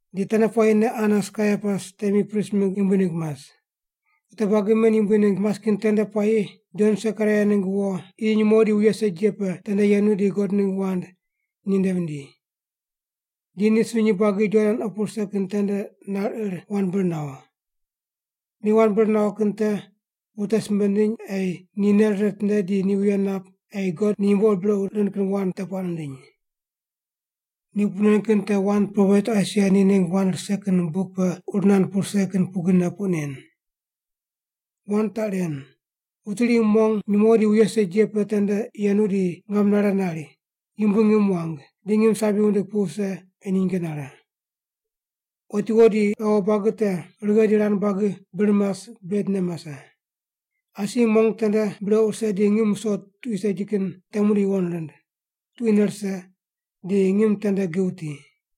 Di tende puayine Anas Kaiapas temi prist mingg yumbui ningg mas. Wute buagi men yumbui ningg mas kin tende puayi Jon Sekaraia ningg wo qi nyumo di wuye segi ye pe tende yenu di God ningg wand ni nde vindi. Di ni sunyi buagi Jordan opu rise kin tende nar ir wand bir nawo. Ni wand bir nawo kin te wute simbe nindiny ei ni nei rire ritinde di ni wuye nap ei God ni yumbo ur brequ rind kin wand te puaq nindiny. Ni puq nen kin te wand propet Aisaia ni ningg wand rise ye buk pe ur nand pu rise kin pugrine puq nen. Wand taq ren: “Wuti iri mong nyumo di wuye segi ye pe tende yenu di ngam nare nari, ‘Yumbui ngim wuang, di ngim sabi wundig pu wuse ei ni nyinge nare. Otiwo di ghawo buagi te righe di rand buagi bir mas bedne mase. Asi mong tende brequ rise di ngim wuso tuqui segi kin te mune yuwon rind, tuquine rise, di ngim tende gi wuti.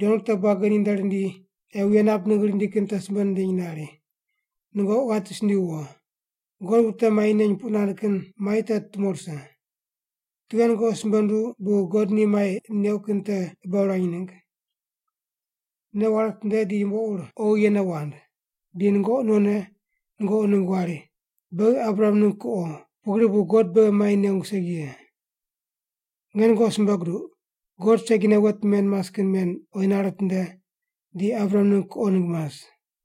Jon wute buagi ninde rindi ei wuye nap ningg rindi kin te simbe nindiny nari, “Nungoqi ghati sindiyu wo! God wute mai neny puq nand kin mai te tumo rise. Tughe nungoqi simbe nunduw bu God ni mai neuq kin te qibe wurany ningg? Nei ware witinde di yumbo ur oghi yene wand. Di nungoqi nonne nungoqi ningg wari, ‘Beghi Abraham ningg kuqo, pugri bu God beghi mai nengu segi ye.’ Nge nungoqi simbe guduq, God segine wet men mas kin men oyi nare nitinde di Abraham ningg kuqo ningg mas.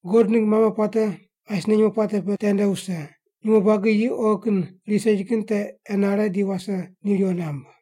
God ningg mame puate asine nyumo puate pe tende wuse, nyumo buagi yi oghi kin riyi segi kin te enare di wase ni riwo namb.”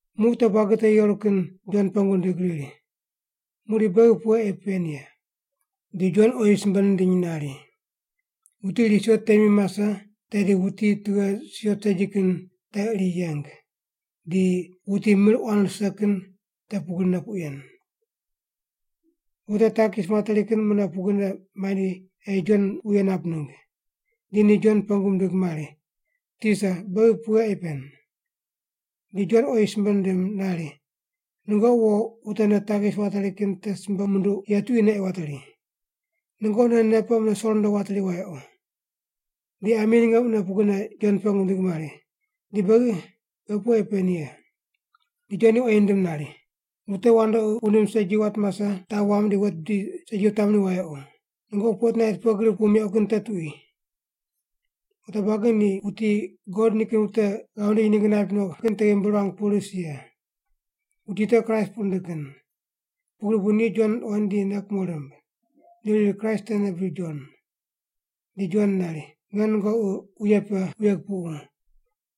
Muq wute buagi te yeru kin Jon pengu rindig riri, “Muqdi beghi pughe ei pen ye?” Di Jon oyi simbe nindiny nari, “Wuti iri siot temi mase tedi wuti tughe siot segi kin te iri yeng, di wuti mir quan rise kin te pugrine puq yen.” Wute takis materi kin mune pugrine mandi ei Jon wuye nap ningg. Di ni Jon pengu mindig mari, “Tisa, beghi pughe ei pen?” Di Jon oyi ni simbe nindim nari, “Nungoqi wo wute nde takis wateri kin te simbe munduq ye tuquine ei wateri. Nungoqi non nei pe mune so rundo wateri wayequ.” Di ami ninge ni mune pugrine Jon pengu mindig mari, “Di beghi? Beghi pughe ei pen ye?” Di Jon ni oyi nindim nari, “Wute wandoqi wundim segi wat mase taq wamb di wet bidi segi wutamri wayequ. Nungoqi fotnait pughe gri pu meuq kin te tuqui.” Wute buagi ni wuti God nikin wute ghav nindiny ningg naip no kin te ghimbi ruang pu ris ye. Wuti te Kraist puq rindig kin. Pugri bu ni Jon ruqoind di nei kumo rimb. Ni riri Kraist tene bri Jon. Di Jon nari, “Nge nungoqi wuye pe wuye kupuqu.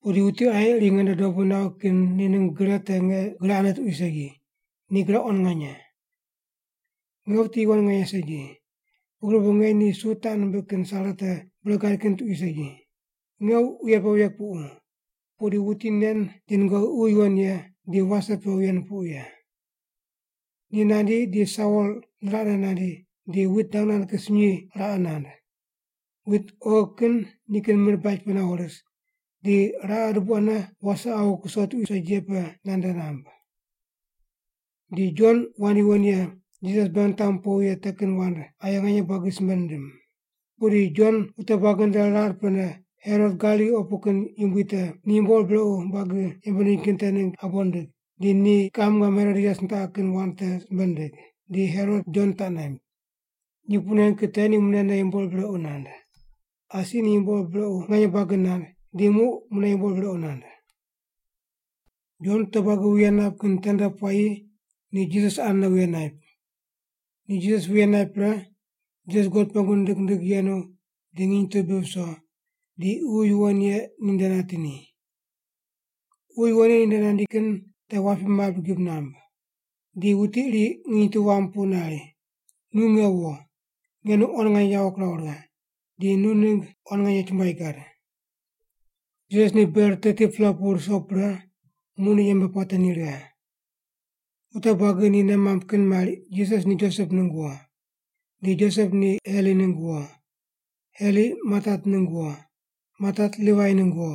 Pudi wuti aye iri nge nde dobu nawi kin ningg gre te nge gre ane tuqui segi, ni gre quan nganye. Nge wuti yuwon nganye segi, pugri bu nge ni su taq nimbiq kin sare te bure gad kin tuqui segi. Nge wuye pe wuye kupuqu, pudi wuti nen di nungoqi Ququ Yuwon Ye di wase pe wuye nupuqu ye. Ni nandi di sawol niraqne nandi di wit dang nand kin sunyi raqe nand. Wit oghi kin nikin mir baj pe nawo ris, di raqe dubu ane wase awu kuso tuqui segi ye pe nande namb.” Di Jon wand yuwon ye Jisas beghi nitamu powi ye te kin wand aye nganye buagi simbe nindim. Pudi Jon wute buagi nde rar pene Herot Galili opu kin yumbui te ni yumbo ur brequ buagi yembe nindiny kin te ningg abo nindig, di ni kiqam ngam Herodias nitaqi kin wand te simbe nindig, di Herot Jon taq naimb. Ni puq nen kin te ni munene yumbo ur brequ nand. Asi ni yumbo ur brequ nganye buagi nand di muq mune yumbo ur brequ nand. Jon wute buagi wuye nap kin tende puayi ni Jisas anene wuye naip. Ni Jisas wuye naip pre, Jisas God pengu nindig nindig yenu di nginy tu bi viso, di Ququ Yuwon Ye ni nde nati ni. Ququ Yuwon Ye ni nde nandi kin te wapi mabri gib namb. Di wuti iri nginy tu wam pu nari, “Nu nge wo. Nge nu quan nganye yawo kiraw righe, di nu ningg quan nganye chumbuai gad.” Jisas ni ber 30-pela pu ruso pre muq ni yembe puate ni righe. Wute buagi ni nei mamb kin mari Jisas ni Josep ningg wo. Di Josep ni Heli ningg wo, Heli Matat ningg wo, Matat Livai ningg wo,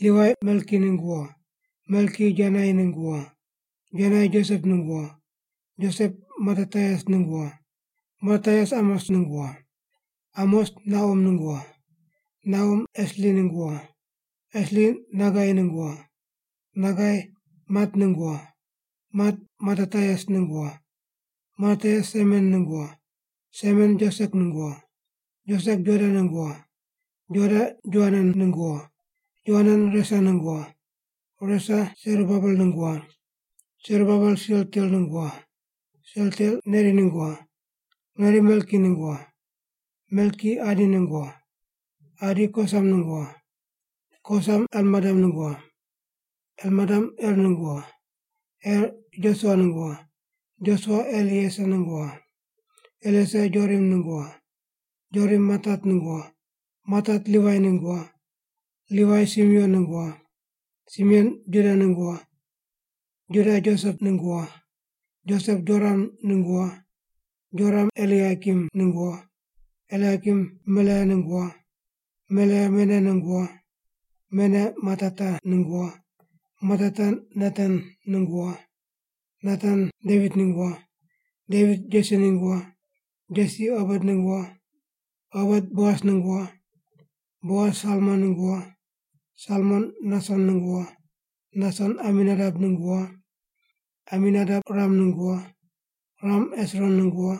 Livai Melki ningg wo, Melki Janai ningg wo, Janai Josep ningg wo, Josep Matatias ningg wo, Matatias Amos ningg wo, Amos Nahum ningg wo, Nahum Esli ningg wo, Esli Nagai ningg wo, Nagai Mat ningg wo, Mat Matatias ningg wo, Matatias Semen ningg wo, Semen Josek ningg wo, Josek Joda ningg wo, Joda Joanan ningg wo, Joanan Resa ningg wo, Resa Serubabel ningg wo, Serubabel Sealtiel ningg wo, Sealtiel Neri ningg wo, Neri Melki ningg wo, Melki Adi ningg wo, Adi Kosam ningg wo, Kosam Elmadam ningg wo, Elmadam Er ningg wo, Er Josua ningg wo, Josua Elieser ningg wo, Elieser Jorim ningg wo, Jorim Matat ningg wo, Matat Livai ningg wo, Livai Simeon ningg wo, Simeon Juda ningg wo, Juda Josep ningg wo, Josep Jonam ningg wo, Jonam Eliakim ningg wo, Eliakim Melea ningg wo, Melea Mena ningg wo, Mena Matata ningg wo, Matata Natan ningg wo, Natan Devit ningg wo, Devit Jesi ningg wo, Jesi Obet ningg wo, Obet Boas ningg wo, Boas Salmon ningg wo, Salmon Nason ningg wo, Nason Aminadap ningg wo, Aminadap Ram ningg wo, Ram Hesron ningg wo,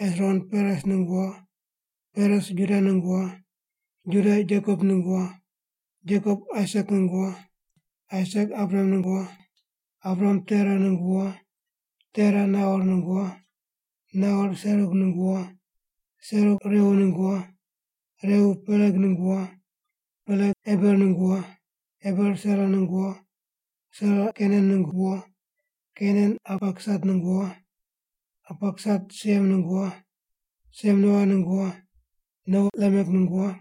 Hesron Peres ningg wo, Peres Juda ningg wo, Juda Jekop ningg wo, Jekop Aisak ningg wo, Aisak Abraham ningg wo, Abraham Tera ningg wo, Tera Nahor ningg wo, Nahor Serug ningg wo, Serug Reu ningg wo, Reu Peleg ningg wo, Peleg Eber ningg wo, Eber Sela ningg wo, Sela Kainan ningg wo, Kainan Arpaksat ningg wo, Arpaksat Siem ningg wo, Siem Noa ningg wo, Noa Lamek ningg wo,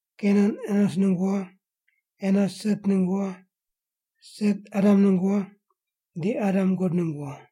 Kenan Enos ningg wo, Enos Set ningg wo, Set Adam ningg wo, di Adam God ningg wo.